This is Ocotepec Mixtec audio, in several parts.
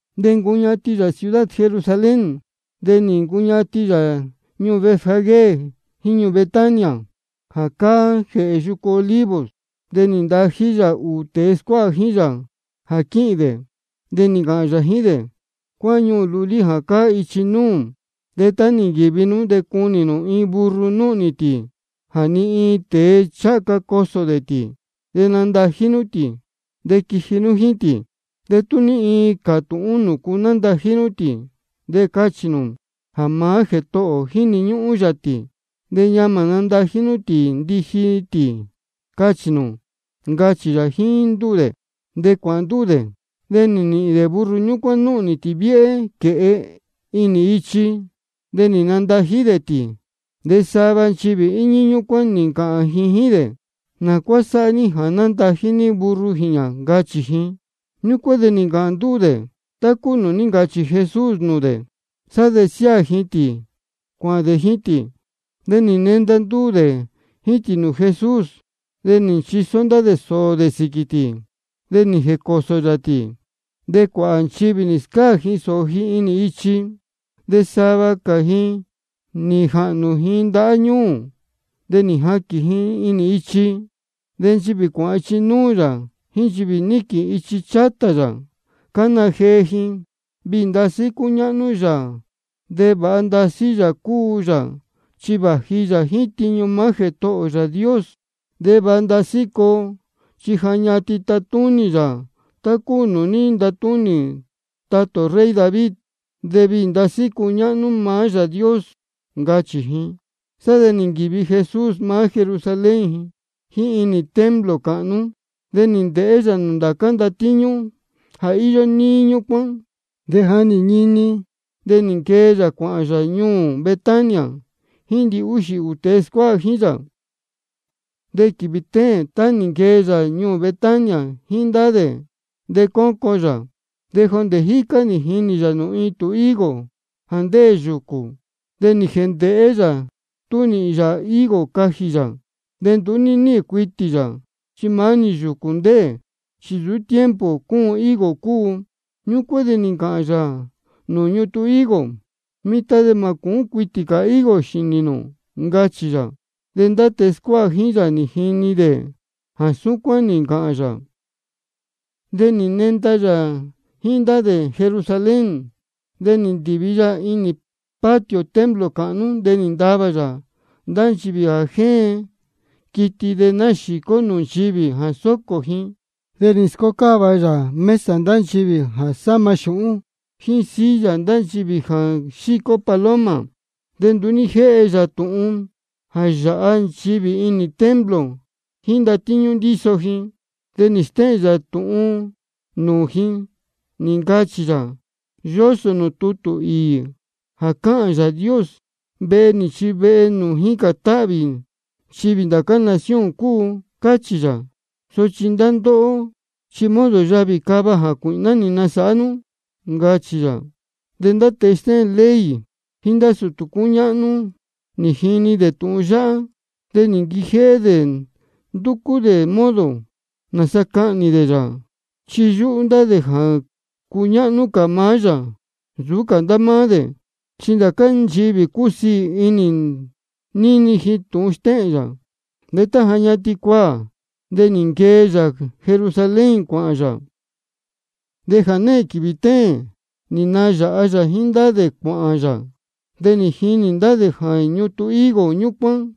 De cuācuñatin yā ciudad Jerusalén, de nī ncuñatin yā ñuū Betfagé jíín ñuū Betania, jā cáá jēhē yucu Olivos. De nī ntají yā ūū tēe scuáha jíín yā jā quíhīn dē. De nī ncāhān yā jíín dē: Cuáhán ñuū lulí jā cáá ichi núū. De tá nī nquīvi nú de cunī nū iin burro núhnī tī, jā ni iin tēe ncháha ca cosō dē tī. De nandají nú tī, de quiji nú jíín tī. De tú ní iin cātūhún nūcu nándají nú tī, de cachī nū jā maá Jētohō ō jíni ñúhún yā tī, de ñamā natají yā tī ndiji tī, cachī nū, ncachī yā jíín ndúū dē. De cuāhān ndúū dē, de nī nīhīn dē burro ñúcuán núhnī tī viéhé quēhe inī ichi. De nī nandají dē tī. De sava nchivī íñí ñúcuán nī ncāhān jíín dē: ¿Nā cuá sáhá ní jā nándají ní burro jīñā? ncachī ji. Ñúcuán de nī ncāhān ndúū dē tá cúu nūū ní ncachī Jesús nūū dē. Sá de nī nsiáā ji tī cuāhān dē jíín tī. De nī nenda ndúū dē jíín tī nūū Jesús. De nī nchisó ndá dē sōō dē sīquī tī, de nī jēcōsō yā tī. De cuāhā nchivī nī scáā ji sōō ji inī ichi. De sava cā ji nī jāhnū ji ndahá ñūū, de nī jaquīn ji inī ichi. De nchivī cuáhān ichi núū yā jíín nchivī níquīn ichi chátā yā, cána jee ji: Viī ndasí cúñáhnú yā. De vāha ndasí Yāā cúu yā chi vāji yā jíín tiñu maá Jētohō ō Yāā Dios. De vāha ndasí coo, chi ja ñatin tatúnī yā tá cúu nūū ní ntatúnī tatā ō rey David. De viī ndasí cúñáhnú maá Yāā Dios, ncachī ji. Sá de nī nquīvi Jesús maá Jerusalén jíín inī templo cāhnú. De nī ndēhé yā nūū ndācá ndatíñú jā íyó níí ñúcuán. De ja nī ñini, de nī nquee yā cuāhān yā ñuū Betania jíín ndihúxī ūū tēe scuáha jíín yā. De quīvī téēn, tá nī nquee yā ñuū Betania jíín ndá dē, de cócon yā. De jondē jícá nī jinī yā iin ñutun higo jā ndéē yūcū. De nī jēndēhé yā tú sanaā nīhīn yā higo jā cajī yā. De nduú ní níhīn cuitī yā, chi maá-ni yūcū ndéē, chi nsūú tiempo cúun higo cúu. Ñúcuán de nī ncāhān yā nūū ñutun higo: Mitan de mā cúun cuitī cā higo xīnī nū, ncachī yā. De ndá tēe scuáha jíín yā nī jini dē jā súcuán nī ncāhān yā. De nī nenda yā jíín ndá dē Jerusalén. De nī ndīvi yā inī patio templo cāhnú, de nī ntavā yā ndá nchivī jā jéen quiti de náxīcó nūū nchivī jā sōcō ji. De nī scócáva yā mesa ndá nchivī jā sáma xūhún, jíín silla ndá nchivī jā xícó paloma. De nduú ní jéhe yā tūhun jā yāha nchivī inī templo jíín ndatíñú ndíso ji. De nī stéhēn yā tūhun nūū ji, nī ncachī yā: Yósō nūū tutū īī jā cáhān Yāā Dios: Vehe nī chi vehe nūū jícān táhvī nchivī ndācá nación cúu, cáchī yā. Sochi ndá ndóhó, chi modo yavī cava jācuīhná nī nasāhá nú, ncachī yā. De ndá tēe stéhēn tutū ley jíín ndá sūtū cúñáhnú, nī jini dē tūhun yáhá, de nī nquijéhé dē ndúcú dē modo nāsa cahnī dē yā. Chi yúhú ndá dē jā cuñáhnú cā maá yā nsūú cā ndá máá dē, chi ndācá nchivī cúsiī ndasí inī ji níni ji tūhun stéhēn yā. De tá ja ñatin cuaā, de nī nquee yā Jerusalén cuāhān yā. De jānehēn quīvī téēn nī nayāha yā jíín ndá dē cuāhān yā. De nī jinī ndá dē jā ñutun higo ñúcuán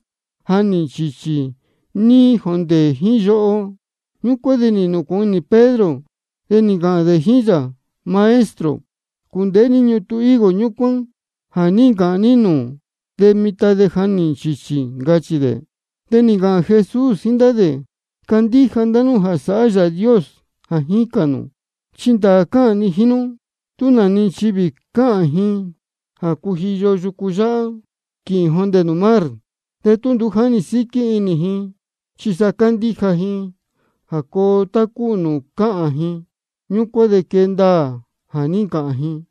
ja nī nchīchī níí jondē jíín yoho. Ñúcuán de nī nūcūhun inī Pedro, de nī ncāhān dē jíín yā: Maestro, cūndēhé ní ñutun higo ñúcuán jā ní ncāhān ní nūū, de mitan ja nī nchīchī, ncachī dē. De nī ncāhān Jesús jíín ndá dē: Candíja ndá nú jā sāhá Yāā Dios jā jícān nū. Chi ndāā cáhān ni jíín nú, tú nā-ni nchivī cāhān ji jā cujiyo yucu yáhá quīhīn jondē nūū mar, de tú nduú jáni síquí inī ji, chi sa cándíja ji jā coo tá cúu nūū cáhān ji, ñúcuán de quee ndaā jā ní ncāhān ji.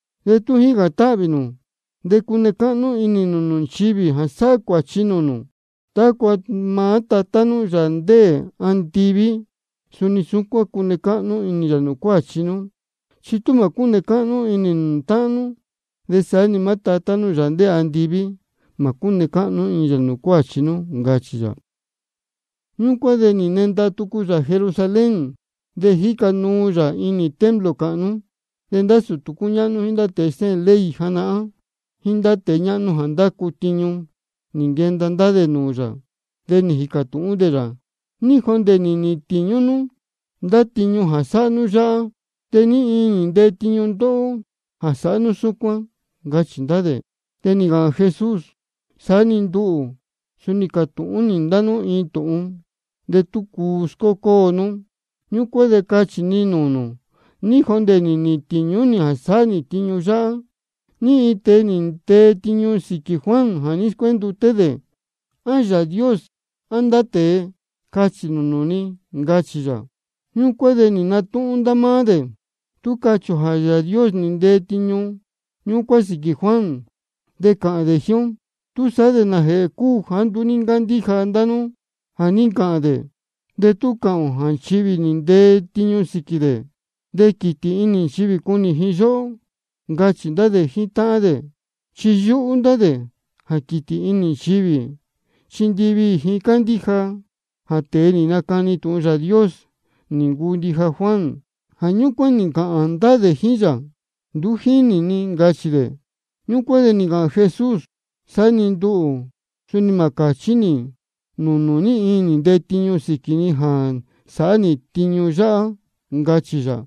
De tá jícān táhvī nū, de cune cáhnú inī nū nūū nchivī jā sáhá cuāchi nūū nū, tácua maá Tatá nú, Yāā ndéē andiví, suni cune cáhnú inī yā nūū cuāchi nú. Chi tú mā cúne cáhnú inī nū nūū táhán nú, de saá-ni maá Tatá nú, Yāā ndéē andiví, mā cúne cáhnú inī yā nūū cuāchi nú, ncachī yā. Ñúcuán de nī nenda tucu yā Jerusalén, de jíca nuu yā inī templo cāhnú. De ndá sūtū cúñáhnú, jíín tēe stéhēn ley janahán, jíín tēe ñáhnú jā ndácu tiñu, nī nquenda ndá dē nūū yā. De nī jīcā tūhún dē yā: ¿Ní jondē nī nīhīn tīñú nú ndá tiñu jā sáhá nú yáhá? ¿De ní iin nī ntee tiñu ndóhó jā sáhá nú súcuán? ncachī ndá dē. De nī ncāhān Jesús: Saá-ni nduhū suni cātūhún nī ndá nú iin tūhun. De tú cuu scócóo nú, ñúcuán de cachī ni nūū nū ní jondē nī nīhīn tīñú nī jā sáhá nī tiñu yáhá. ¿Ní iin nī ntee tiñu sīquī Juan jā ní scuénduté dē? ¿A Yāā Dios á ndá tēe? Cachī nūū ni, ncachī yā. Ñúcuán de nī natúhún ndá máá dē: Tú cachī ō jā Yāā Dios nī ntee tiñu ñúcuán sīquī Juan, de cāhān dē jíín ó: ¿Túsaá de nājēhē cúu jāá nduú ní ncándíja ndá nú jā ní ncāhān dē? De tú cāhān ō jā nchivī nī ntee tiñu sīquī dē, de quītī inī nchivī cunī ji yóhó, ncachī ndá dē jíín táhán dē. Chi yúhú ndá dē jā quītī inī nchivī, chi ndiviī ji cándíja ji jā tēe nī nacani tūhun Yāā Dios nī ncuu ndija Juan. Jā ñúcuán nī ncāhān ndá dē jíín yā: Nduú jínī ni, ncachī dē. Ñúcuán de nī ncāhān Jesús: De saá-ni nduhū, suni mā cāchí nī nūū nū ní iin nī ntee tiñu sīquī ni jā sáhá nī tiñu yáhá, ncachī yā.